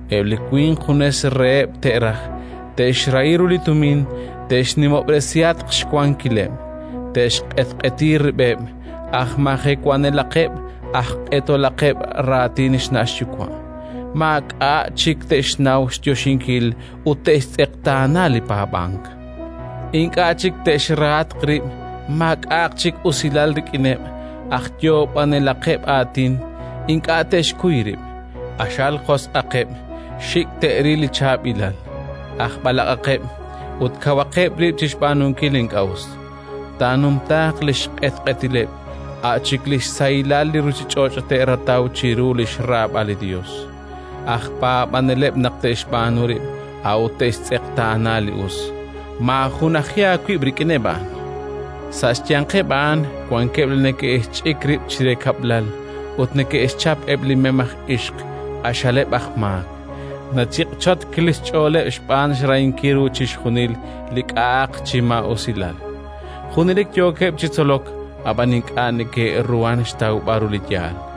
Eb' li winq junes reheb' te'raj, te'xrahi ru li tumin, te'xnimob'resihatq xwankileb', te'xq'etq'eti rib'eb', aj majewanelaqeb', aj q'etolaqeb' raatin xna' xyuwa', maak'a' chik te'xnaw xyoxinkil ut te'xtz'eqtaana li paab'ank. Ink'a' chik te'xrahatq rib', maak'a'aq chik usilal rik'ineb', aj yoob'anelaqeb' aatin, ink'a' te'xkuy rib', q'axal josq'aqeb', xik' te'ril li chaab'ilal, aj b'alaq'aqeb' ut kawaqeb' rib' chi xb'aanunkil li ink'a' us. Taanumtaaq li xq'etq'etileb', a' chik li xsahilal li ruuchich'och' te'rataw chiru li xraab'al li Yos, aj paab'aneleb' naq te'xb'aanu rib', a'ut te'xtz'eqtaana li us. Maajunaji aawib' rik'ineb' a'an. Sa' xyanqeb' a'an wankeb' li neke'xch'ik rib' chire kab'lal ut neke'xchap eb' li mem aj ixq q'axaleb' aj maak, nachiq'chotk li xch'ooleb' xb'aan xrahinkil ru chixjunil li k'a'aq chi maa'usilal. Junelik yookeb' chi tzolok, ab'an ink'a' neke'ruhank xtawb'al ru li yaal.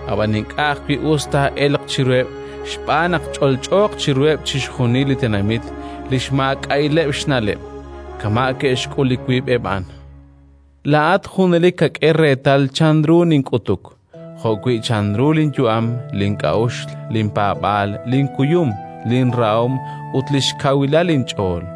Ab'an ink'a' ajwi' us taa'elq chiruheb' xb'aan naq ch'olch'ooq chiruheb' chixjunil li tenamit li xmaak'a'ileb' xna'leb', kama' ke'xk'ul li wiib'eb' a'an. Laa'at junelik kak'e reetal chanru nink'utuk, jo'wi' chanru linyu'am, link'a'uxl, linpaab'aal, linkuyum, linrahom ut li xkawilal linch'ool,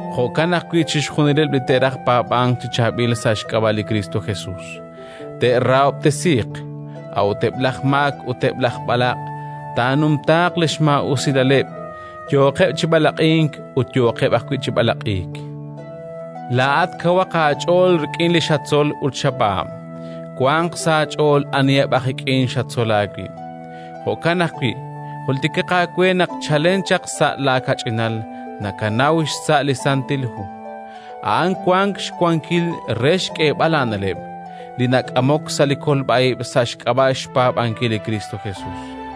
Jo'kan ajwi' chixjunileb' li te'raj paab'ank chi chaab'il sa' xk'ab'a' li Kristo Jesus, te'rahob'tesiiq. A'ut eb' laj maak ut eb' laj b'alaq' taanumtaaq li xmaa'usilaleb', yooqeb' chi b'alaq'ink ut yooqeb' ajwi' chi b'alaq'iik. Laa'at kawaq aach'ool rik'in li xatzol ut xapaab'. Wanq sa' aach'ool aniheb' aj ik'in xatzol aawib'. Jo'kan ajwi' jultikaq aawe naq chalen chaq sa' laakach'inal nakanaw xsa' li Santil Hu. A'an wank xwankil re xk'eeb'al aana'leb' li nak'amok sa' li kolb'a ib' sa' xk'ab'a' xpaab'ankil li Kristo Jesus.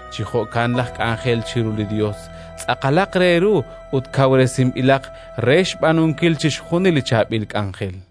Chi jo'kan laj k'anjel chiru li Yos tz'aqalaq re ru ut kawresinb'ilaq re xb'aanunkil chixjunil li chaab'il k'anjel.